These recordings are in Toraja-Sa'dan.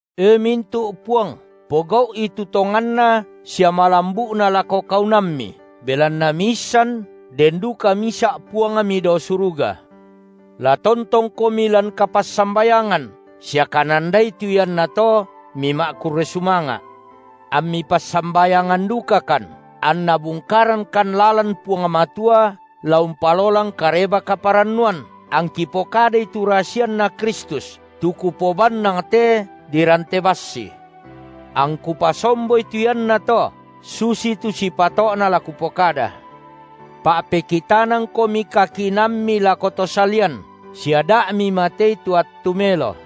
E mintu’ puang, pogau’i tu tonganna sia malambu’na lako kaunammi, belanna miisan den duka misa’ Puangmi dao suruga. La tontongkomi lan kapassambayangan sia kanandai tu iannato mima’kurre sumanga’. Ammi passambayangan dukakan, anNa bungkarangkan lalan Puang Matua la umpalolang Kareba-kaparannuan, angki pokadai tu rasianNa Kristus, tu kupobannang te dirante bassi. Angku pasomboi tu iannato, susitu sipato’na la kupokada. Pa’pekitanangkomi kakinaammi lako to salian sia da’ mimatei tu attu melo.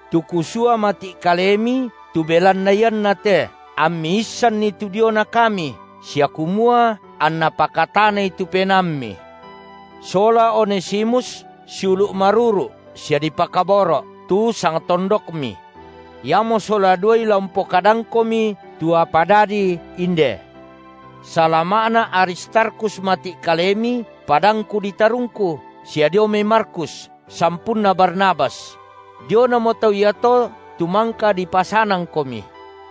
Tu kusua mati’ kalemi tu belanna iannate, ammi issanni tu diona kami, sia kumua anna pakatanai tu penaammi. Sola Onesimus, siulu’ maruru’ sia dipakaboro’, tu sangtondokmi. Iamo sola duai la umpokadangkomi tu apa dadi inde. Salama’na Aristarkhus mati’ kalemi, padangku ditarungku, sia dio mai Markus, sampunna Barnabas – dionamo tau iato tu mangka dipasanangkomi;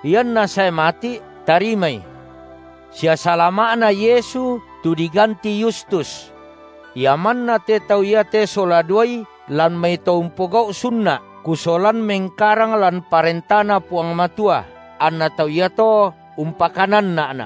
ianna sae mati’ tarimai –, sia salama’na Yesu tu diganti Yustus. Ia manna te tau iate sola duai lan mai to umpogau’ sunna’, kusolan mengkarang lan parentaNa Puang Matua, anna tau iato umpakananna’na’.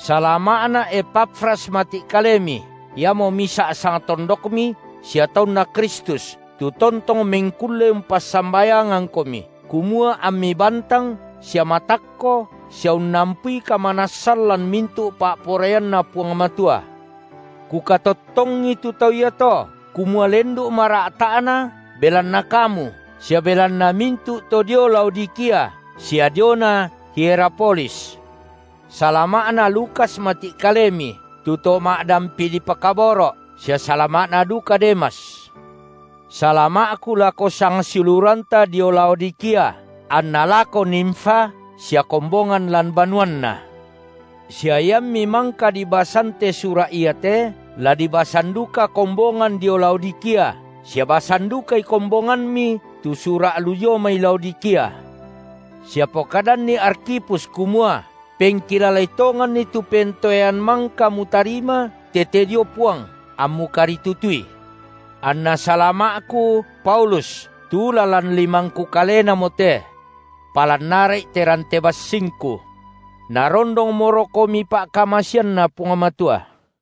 Salama’na Epafras mati’ kalemi, iamo misa’ sangtondokmi sia taunNa Kristus, tu tontong mengkulle umpassambayangangkomi, kumua ammi bantang sia matakko sia unnampui kamanassan lan mintu’ pa’poraianNa Puang Matua. Kukatottongi tu tau iato kumua lendu’ mara’ta’na belanna kamu sia belanna mintu’ to dio Laodikia sia diona Hierapolis. Salama’na Lukas mati’ kalemi, tu to ma’dampi dipakaboro’, sia salama’na duka Demas. Salama’ku lako sangsiuluranta dio Laodikia, anna lako Nimfa sia kombongan lan banuanna. Sia iammi mangka dibasan te sura’ iate, la dibasan duka kombongan dio Laodikia, sia basan dukai kombonganmi tu sura’ lu dio mai Laodikia. Sia pokadanni Arkhipus kumua: Pengkilalai tonganni tu pentoean mangka mutarima tete dio Puang, ammu karitutui. Anna salama’ku, Paulus, tu lalan limangku kalenamo te. Palan ara’i te rante bassingku. Narondongmorokomi pa’kamaseanNa Puang Matua.